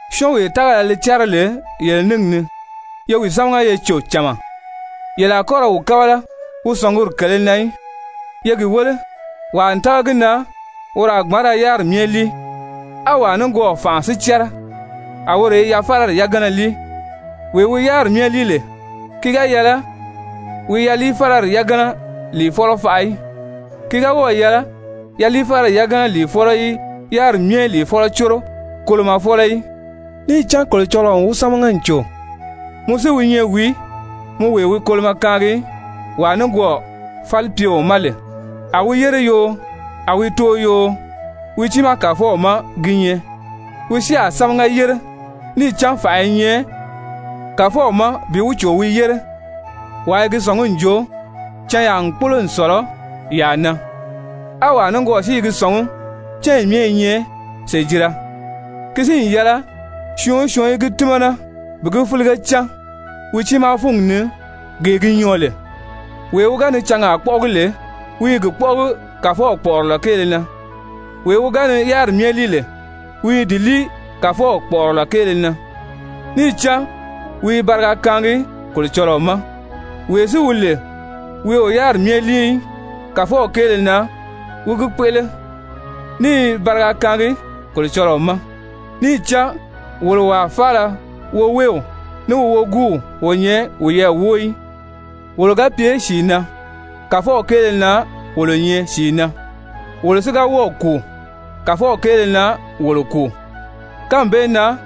Syɔ́ɔnwee tágala li cɛ́rɛ lè yele níngi ni, ye wi sámaga ye cò cama, yele a kɔ́ ra wi kábala wi sɔ̀nguri kèlē na í. Ye gi wéle, wàa n tága gi na woro a gbǎn ra yáriri myɛ líi, á wàa nikwɔɔ fànʔa si cɛ́rɛ, a woro i yaliifálari yagana líi. Wee wi yáriri myɛ líi lè, ki ga yɛlɛ wi yaliifálari yagana lìifɔlɔ faʔa í, ki ga wɔ́ɔ̀ yɛlɛ yaliifálari yagana lìifɔlɔ í yáriri myɛ lìifɔlɔ córo kolomɔfɔlɔ í, níì cán Kolocɔlɔɔ n wi sámaga n cò. Mɔ si wi nyɛ wìí, mɔ wee wi kolomɔ kaangi wàa nikwɔɔ falipyeo ma lè? A wi yére yoo, a wi too yoo, wi tiimaa kàfɔw má gi nyɛ. Wi si a sámaga yére, níì cán fànʔa i nyɛ Kàfɔw ma bi wi cò wi yére. Wàa i gi sɔ̀ngí n jo canyaa n kpólo n sɔ̀lɔ yàa na, á wàa nikwɔɔ si i gi sɔ̀ngí cányi myɛ i nyɛ sèjira. Ki si n yɛlɛ syɔɔn o syɔɔn í gi tímana bi gi fílige cán wi tiimaa fúngi ni gee gi nyɔɔ lè. Wee wi ga ni cangaa kpɔ́ʔɔgi lè, wi i gi kpɔ́ʔɔgi Kàfɔw kpɔ̀ʔɔrɔlɔ kéele na. Wee wi ga ni yáriri myɛ líi lè, wi i di líi Kàfɔw kpɔ̀ʔɔrɔlɔ kéele na, níì cán wi i bariga kaangi Kolocɔlɔɔ ma. Wee si wi lè wi o yáriri myɛ líi í, Kàfɔw kéele na wi gi kpéʔele, ní i bariga kaangi Kolocɔlɔɔ ma. Níì cán wolo wàa faala woweew, ní wi woguuw o nyɛ wiyɛɛ wóo í. Wolo ga pye sìi na, Kàfɔw kéele na wolo nyɛ sìi na. Wolo si ga wɔ́ɔ̀ kùu, Kàfɔw kéele na wolo kùu. Kánmi bee na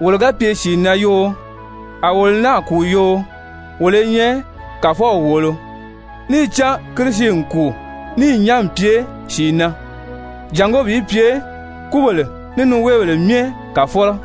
wolo ga pye sìi na yoo, a wolo náà kùu yoo, wolo i nyɛ Kàfɔw wòolo. Níì cán Kirisi n kùu níì nyán n pye sìi na jàngó bi pye kúbèle ní niweebèle myɛ Kàfɔlɔ.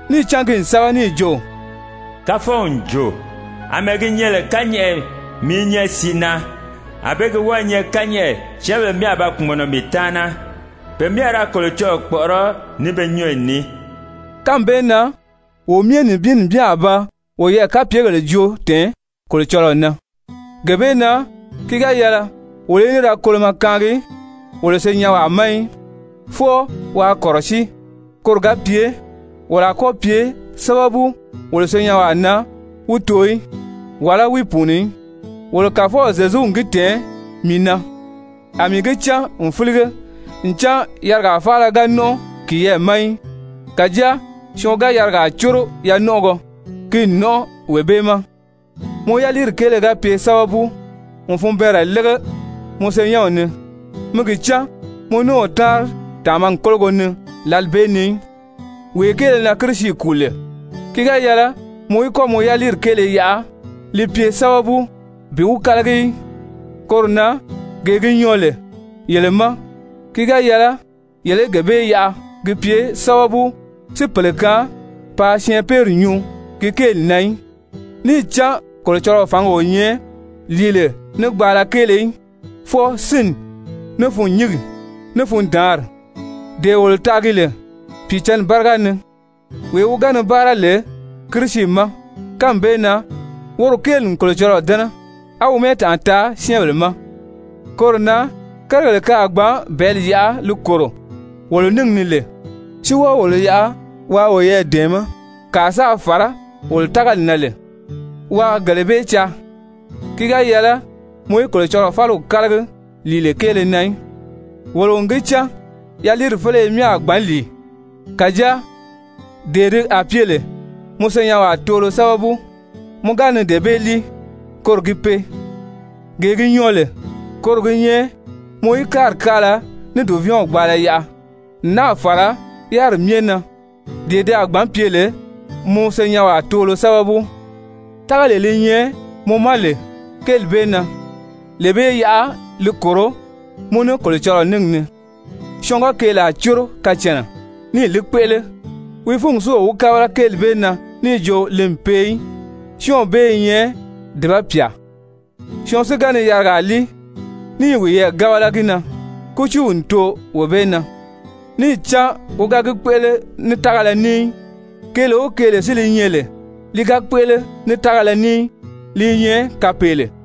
Níì cán ki n sɛ́bɛ níì jo: «Kàfɔw n jo: ‹Amɛɛ gi nyɛ lè kányɛʔɛ mii i nyɛ sìi na, ànbée gi wɔ́ɔ̄ nyɛ kányɛʔɛ syɛ́ɛnbèle myɛ a ba kpùmɔnɔ mii taana. Pe myɛ a ra Kolocɔlɔɔ kpɔ̀ʔɔrɔ́ ní be nyɔ́ɔyi ní.›» Kánmi bee na wo myɛ nibin nibin a ba woyɛɛ kapyegèle joo tɛ̀ɛn Kolocɔlɔɔ na. Gee bee na ki ga yɛlɛ wolo í ní ra kolomɔ kaangi wolo senyɛnwaa ma í, fwɔɔ waa kɔ̀rɔsíi koro ga pye wolo a kɔ́ pye sábabu wolo senyɛnwaa na wi too í, wàlá wi pùuni í. Wolo Kàfɔw Zyezu n gi tɛ̀ɛn mii na, a mii gi cán n fílige ncan yarigaa faala ga nɔ́nʔɔ kiyɛɛ ma í. Kàjáa syɔɔn ga yarigaa córo yanɔnʔɔgɔ, ki n nɔ́nʔɔ wee bee ma. Mɔ yaliiri kéele ga pye sábabu n funbɛɛnrɛ lége mɔ senyɛnw ni, mi gi cán mɔ ní o táanri tàmagi kólogo ni lǎli bee ni í. Wee kéele na Kirisi kùu lè, ki ga yɛlɛ mɔ í kɔ́ mɔ yaliiri kéele yaʔa li pye sábabu bi wi kálagi í. Koro na gee gi nyɔɔ lè yele ma, ki ga yɛlɛ yele í gee bee yaʔa ki pye sábabu si pèle kaan paa syɛɛnpeere nyuu ki kéeli na í. Níì cán Kolocɔlɔɔ fǎngi o nyɛ lìile ní gbaala kéele í, fwɔɔ sínni, ní fûnnyingi, ní fundaanri, dee wolo taagi lè Pìicǎnni báriga ni. Wee wi ga ni báara lè Kirisi ma kánmi bee na, woro kéeli n Kolocɔlɔɔ dɛ́nɛ, á wi mɛ́ɛtanʔa taa syɛ́ɛnbèle ma. Koro na kérigèle ke a gbǎn bɛ̀ɛ́li yaʔa li kòro wolo níngi ni lè, si wɔ́ɔ wolo yaʔa waa woyɛɛ dɛ̀ɛmɛ́ kàa sáā fàrá wolo tágali na lè, waa gele bee caa. Ki ga yɛlɛ mɔ í Kolocɔlɔɔ fáliw kálagi lìile kéele na í. Wolo n gi cán yaliiri féleye myɛ a gbǎn lìi. Kàjáa dee ti a pye lè mɔ senyɛnwaa toolo sábabu, mɔ ga dee bee lìi, koro gi pee. Gee gi nyɔɔ lè, koro gi nyɛ mɔ í káari káala ní dùvɛɛnw gbaala yaʔa n náà fàra yáriri myɛ na, dee ti a gbǎn pye lè mɔ senyɛnwaa toolo sábabu. Tágalee li nyɛ mɔ ma lè kéeli bee na, lee bee yaʔa li kòro mɔ ní Kolocɔlɔɔ níngi ni. Syɔɔn ga keelaa córo kacànna níì li kpéʔele, wi fúngi si o wi kábala kéeli bee na níì jo li n pee í, syɔ́ɔnw bee i nyɛ dùba pyà! Syɔɔn si ga ni yarigaa líi ní i wiyɛɛ gábala gi na, kútiiw n too wee bee na, níì cán wi ga gi kpéʔele ní tágala ní í. Keele o keele si li nyɛ lè li ga kpéʔele ní tágala ní í, li i nyɛ kapeele.